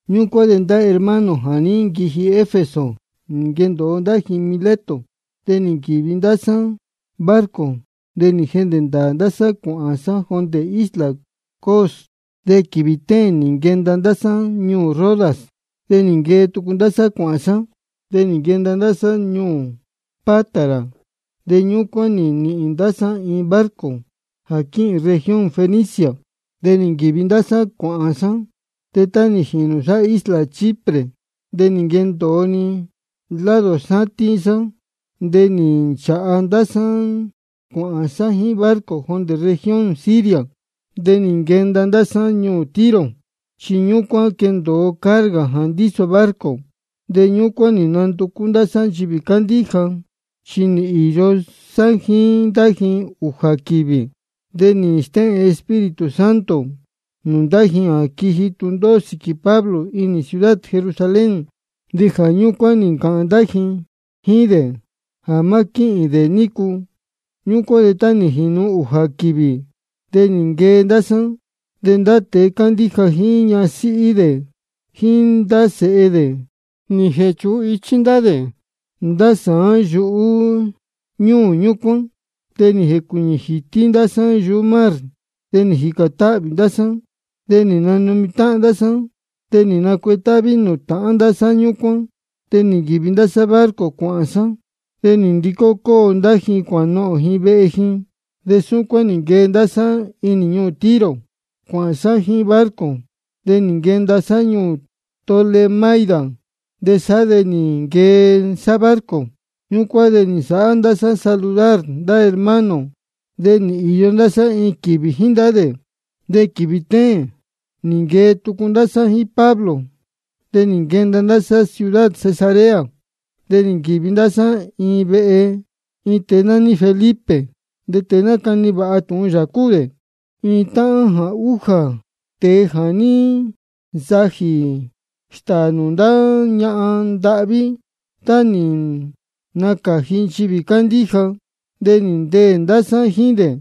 Ñúcuán de ndá hermano jā ní nquiji Efeso nī nquendōo ndá ji Mileto. De nī nquīvi ndá sá barco, de nī jehndē ndāā ndá sá cuāhān sá jondē isla Cos. De quīvī téēn nī nquenda sá ñuū Rodas. De nī nquee tucu ndá sá, de nī nquenda sá ñuū Pátara. De ñúcuán nī nīhīn ndá sá iin barco jā quíhīn región Fenicia, de nī nquīvi ndá sá cuāhān sá. De tá nī jinī sá isla Chipre de nī nquendōo-ni lado sátín sá, chi nī nchāha ndá sá cuāhān sá jíín barco jondē región Siria. De nī nquenda ndá sá ñuū Tiro, chi ñúcuán quendōo carga jā ndíso barco. De ñúcuán nī nanducú ndá sá nchivī cándíja, de nī īyo sá jíín ndá ji ūjā quīvī. De nī stéhēn Espíritu Santo nūū ndá ji jā quiji tūndóhó sīquī Pablo inī ciudad Jerusalén, de jā ñúcuán nī ncāhān ndá ji jíín dē jā má quíhīn dē nícu. Ñúcuán de tá nī jīnu ūjā quīvī de nī nquee ndá sá. De ndá tēe cándíja jíín ñasíhí dē jíín ndá sēhe dē, nī jēchūhun ichí ndá dē ndá sāán yuhú ñúū ñúcuán. De nī jēcuīñī jītí ndá sá yuhú mar, de nī jīcān táhvī ndá sá. De nī nanumi táhán ndá sá de nī nacuetáhví nūū tāhán ndá sá ñúcuán. De nī nquīvi ndá sá barco cuāhān sá, de nī ndicó cóo ndá ji cuānohōn ji vehe ji. De súcuán nī nquee ndá sá inī ñuū Tiro cuāhān sá jíín barco, de nī nquenda sá ñuū Tolemaida de sá de nī nquee sá barco. De ñúcuán nī nsāhá ndá sá saludar ndá hermano, de nī īyo ndá sá iin quīvī jíín ndá dē. De quīvī téēn nī nquee tucu ndá sá jíín Pablo, de nī nquenda ndá sá ciudad Cesarea. De nī nquīvi ndá sá inī vehe iin tēe nání Felipe. De tēe nácani tūhun vāha yā cúu dē, de cúu dē iin táhán jā újā tēe jā ní nsajī stāā nūū ndá ñahan ndahví tá nī nacāji nchivī cándíja. De nī ndeē ndá sá jíín dē.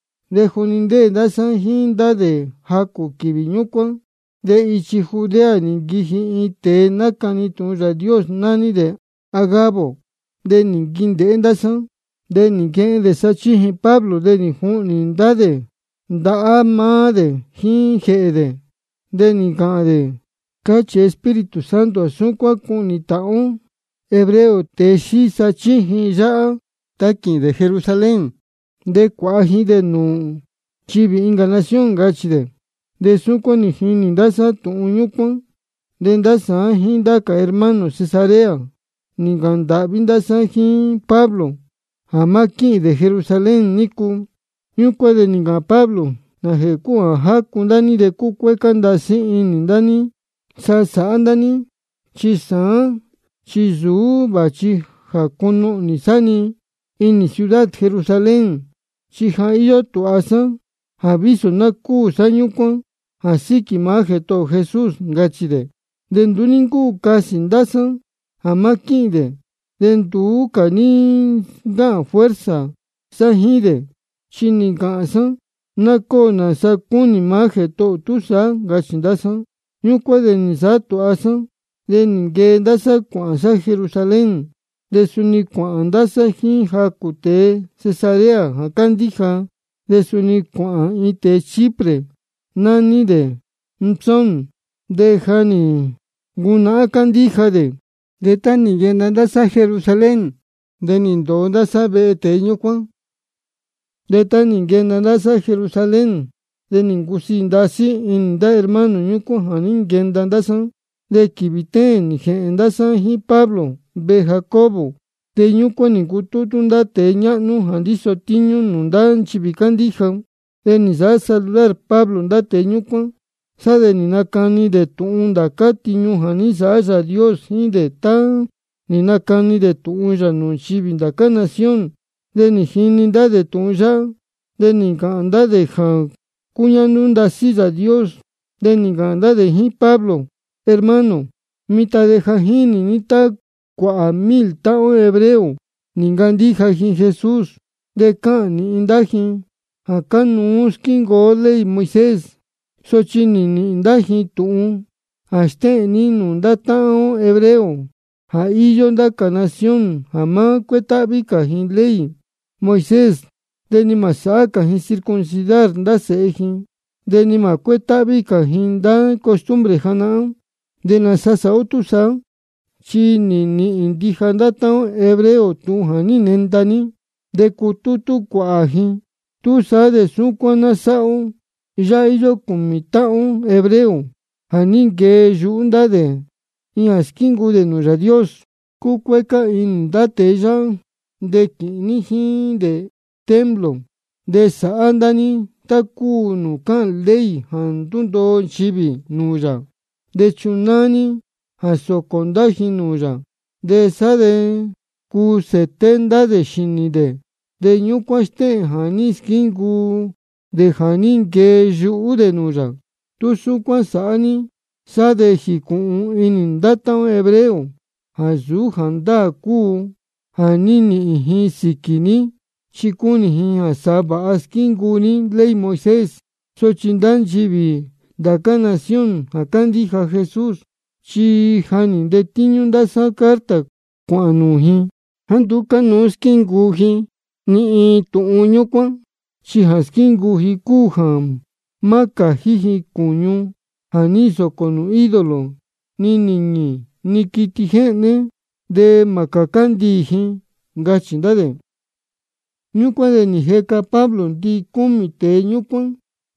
De juni ndéē ndá sá jíín dē jacū quīvī ñúcuán de ichi Judea nī nquiji iin tēe nácani tūhun Yāā Dios, nání dē Agabo. De nī nquindēhé dē ndá sá. De nī nquehen dē sachíjin Pablo, de nī juhnī dē ndahá maá dē jíín jēhē dē, de nī ncāhān dē: Cáchī Espíritu Santo jā súcuán cuhnī táhán ó hebreo tēe xíí sachíjin yáhá tá quīhīn dē Jerusalén. De cuāha ji dē nūū nchivī incā nación, ncachī dē. De jā súcuán nī jini ndá sá tūhun ñúcuán, de ndá sāán jíín ndá cā hermano Cesarea nī ncāhān ndāhví ndá sá jíín Pablo jā má quíhīn dē Jerusalén nícu. Ñúcuán de nī ncāhān Pablo: ¿Nājēhē cúu jā jácu ndá ní de cúcuécá ndasí inī sá sáhá ndá ní? Chi sāán chi nsūú vāchi jā cunuhnī sá-ni inī ciudad Jerusalén, chi ja íyó tūha sá jā vísō ná cúū sá ñúcuán jā síquī maá Jētohō ō Jesús, ncachī dē. De nduú ní ncúu casī ndá sá jā má quíhīn dē. De nduú cā ní ncáhān fuerza sá jíín dē, chi nī ncāhān sá: Ná cóo nāsa cúnī maá Jētohō ō túsaá, ncachī ndá sá. Ñúcuán de nī nsāhá tūha sá de nī nquee ndá sá cuāhān sá Jerusalén. De suni cuāhān ndá sá jíín jacū tēe Cesarea jā cándíja, de suni cuāhān iin tēe Chipre, nání dē Mnasón. De ja nī ncunahán cándíja dē. De tá nī nquenda ndá sá Jerusalén, de nī ndōo ndá sá vehe tēe ñúcuán. De tá nī nquenda ndá sá Jerusalén de nī ncusiī ndasí inī ndá hermano ñúcuán jā ní nquenda ndá sá. De quīvī téēn nī jēhēn ndá sá jíín Pablo vehe Jacobo. De ñúcuán nī ncutútú ndá tēe ñáhnú jā ndíso tíñú nūū ndá nchivī cándíja. De nī nsāhá saludar Pablo ndá tēe ñúcuán. Sá de nī nacani dē tūhun ndācá tiñu jā ní nsāhá Yāā Dios jíín dē tá nī nacani dē tūhun yā nūū nchivī ndá cā nación. De nī jini ndá dē tūhun yáhá, de nī ncāhān ndá dē jā cúñáhnú ndasí Yāā Dios. De nī ncāhān ndá dē jíín Pablo: Hermano, mitan de ja jínī ní tá cuāhā mil táhán ó hebreo nī ncandíja ji Jesús. De cáhān nīhin ndá ji jā cánuú squíncuu ó ley Moisés. Sochi nī nīhīn ndá ji tūhun jā stéhēn ní nūū ndá táhán ó hebreo jā íyó ndá cā nación jā má cuétáhví cā ji ley Moisés de ni mā sāhá cā ji circuncidar ndá sēhe ji de ni mā cuétáhví cā ji ndá costumbre janahán. ¿De nāsa sāhá ó túsaá? Chi nīhīn ndija ndá táhán ó hebreo tūhun jā ní nenda ní, de cutútú cuāhā ji. Túsaá de súcuán ná sáhá ó: Yáhá íyó cūmī táhán ó hebreo jā ní nquee yuhú ndá dē iin jā squíncuu dē nūū Yāā Dios. Cueca ní ndá tēe yáhá, de quīhīn ní jíín dē templo. De sāhá ndá ní tá cúu nūū cáhān ley jā ndúndoo nchivī nūū yā. De chunáá ní jā sōcō ndá dē nūū yā. De sá de cuu sēté ndá dē xīnī dē, de ñúcuán stéhēn jā ní squíncuu dē jā ní nquee yuhú dē nūū yā. Tú súcuán sāhá ní sá de jīcūhun inī ndá táhán ó hebreo jāá nsūú jāndáā cúu tūhun jā ní nīhīn ji sīquī ní, chi cunī ji jā sa vāha squíncuu ní ley Moisés. Sochi ndá nchivī ndá cā nación jā cándíja Jesús, chi ja nī ntetíñú ndá sá carta cuāhān nūū ji jāá nduú cánuú squíncuu ji ni iin tūhun ñúcuán. Chi jā squíncuu ji cúu jā má cājí ji cūñu jā ní nsōcō nūū ídolo ni nīñī ni quiti jéhné, de mā cācá ndiī ji, ncachī ndá dē. Ñúcuán de nī jeca Pablo ndicúmī tēe ñúcuán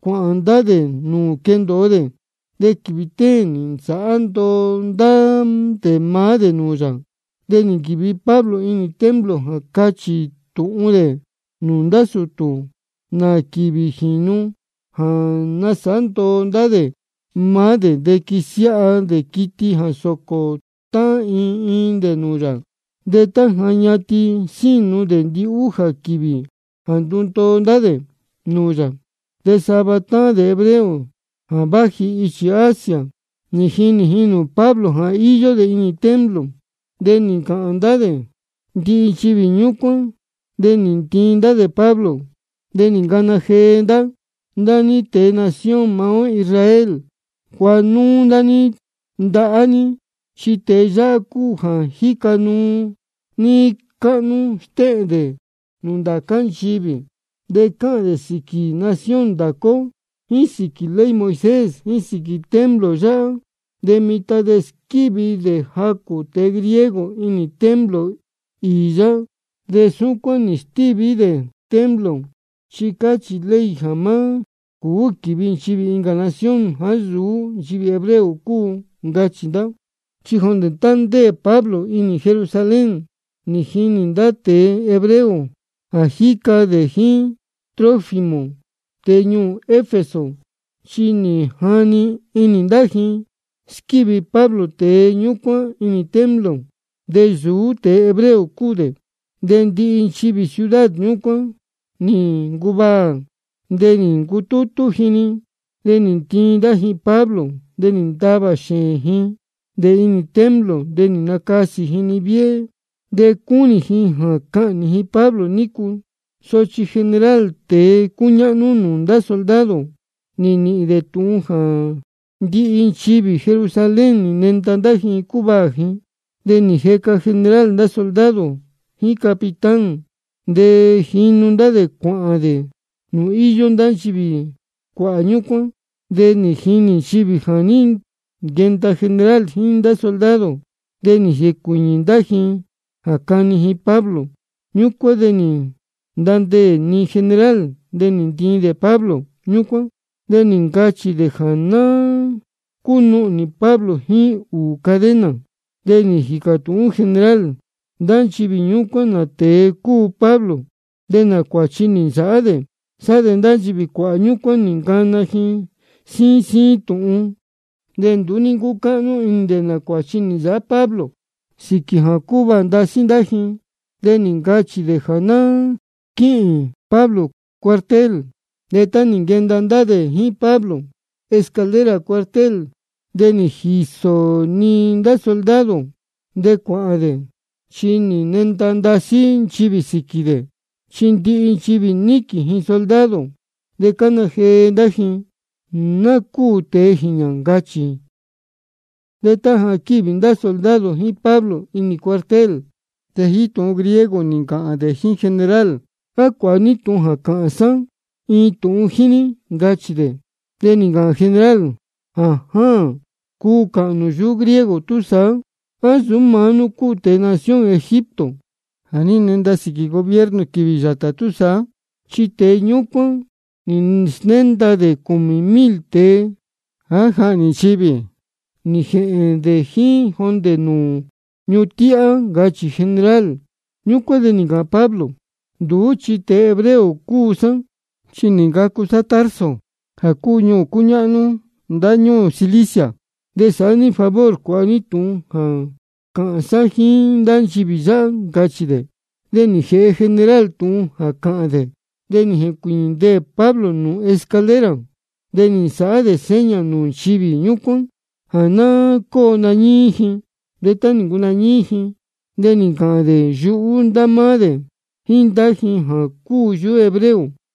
cuāhān ndá dē nūū quendōo dē. De quīvī téēn nī nasāhá ndoo ndá dē maá dē nūū yā. De nī nquīvi Pablo inī templo jā cachī tūhun dē nūū ndá sūtū nā quīvī jīnu jā násāhá ndoo ndá dē maá dē de quīsiáha dē quiti jā sōcō tá iin iin dē nūū yā. De tá ja ñatin sínu dē ndihújā quīvī jā ndúndoo ndá dē nūū yā, de sava táhán dē hebreo jā váji ichi Asia nī jinī nūū Pablo jā íyó dē inī templo. De nī scáhān ndá dē ndihi nchivī ñúcuán, de nī ntiin ndá Pablo. De nī ncana jee ndá: Ndá ní tēe nación maá ó Israel, cuāha núú ndá ní ndahá ní, chi tēe yáhá cúu jā jíca nuu níí cáhnú stéhēn dē nūū ndācá nchivī, de cáhān dē sīquī nación ndācá ó jíín sīquī ley Moisés jíín sīquī templo yáhá. De mitan ja nī squívi dē jacū tēe griego inī templo īī yáhá, de súcuán nī stíví dē templo chi cáhān ley jā má cūú quīvi nchivī incā nación jāá nsūú nchivī hebreo cúu, ncachī ndá. Chi jondē tá ndéē Pablo inī Jerusalén nī jinī ndá tēe hebreo jā jíca dē jíín Trófimo, tēe ñuū Efeso. Chi nī jani inī ndá jā ní squívi Pablo tēe ñúcuán inī templo, de nsūú tēe hebreo cúu dē. De ndihi nchivī ciudad ñúcuán nī ncuvaā. De nī ncutútú ji-ni, de nī ntiin ndá ji Pablo, de nī ntavā xēēn ji dē inī templo. De nī nacasī ji-ni viéhé. De cúnī ji jā cahnī ji Pablo nícu, sochi general, tēe cúñáhnú nūū ndá soldado, nī nīhīn dē tūhun jā ndihi nchivī Jerusalén nī nenda ndá ji cúvaā ji. De nī jeca general ndá soldado jíín capitán, de jínu ndá dē cuāhān dē nūū íyó ndá nchivī cuāhā ñúcuán. De nī jinī nchivī jā ní nquenda general jíín ndá soldado, de nī jencuiñī ndá ji jā cáni ji Pablo. Ñúcuán de nī ntandeē-ni general, de nī ntiin dē Pablo. Ñúcuán de nī ncachī dē jā ná cúnuhnī Pablo jíín ūū cadena. De nī jīcā tūhún general ndá nchivī ñúcuán nā tēe cúu Pablo, de nā cuāchi nī nsāhá dē. Sá de ndá nchivī cuāhā ñúcuán nī ncana ji síín síín tūhun. De nduú ní ncúcáhnú inī dē nā cuāchi nī nsāhá Pablo sīquī jā cúvaā ndasí ndá ji, de nī ncachī dē jā ná quíhīn Pablo cuartel. De tá nī nquenda ndá dē jíín Pablo escalera cuartel de nī jiso-ni ndá soldado dē cuāhān dē, chi nī nenda ndasí nchivī sīquī dē. Chi ndihi nchivī níquīn ji soldado, de cána jee ndá ji: Ná cúū tēe jīñā, ncachī. De tá ja quívi ndá soldado jíín Pablo inī cuartel, de jíín tūhun griego nī ncāhān dē jíín general: ¿A cuāha ní tūhun jā cāhān sá iin tūhun jíín ní? ncachī dē. De nī ncāhān general: Jājáān, cúu cáhān nū yuhú griego túsaá. ¿A nsūú maá nú cúu tēe nación Egipto jā ní nenda sīquī gobierno quīvī yātā túsaá? Chi tēe ñúcuán nī snénda dē cūmī mil tēe jā jáhnī ndīyi nī jēhēn dē jíín jondē nūū ñuhun tíhá, ncachī general. Ñúcuán de nī ncāhān Pablo: Nduú chi tēe hebreo cúu sá, chi nī ncacu sá Tarso jā cúu ñuū cúñáhnú ndáñúū Cilicia. De sāhá ní favor cuāha ní tūhun jā cāhān sá jíín ndá nchivī yáhá, ncachī dē. De nī jēhe general tūhun jā cāhān dē, de nī jēcuīñī ndeē Pablo nūū escalera. De nī nsāhá dē seña nūū nchivī ñúcuán jā ná cóo nañíí ji. De tá nī ncunañíí ji de nī ncāhān dē yuhú ndá máá dē jíín ndá ji jā cúu yuhú hebreo: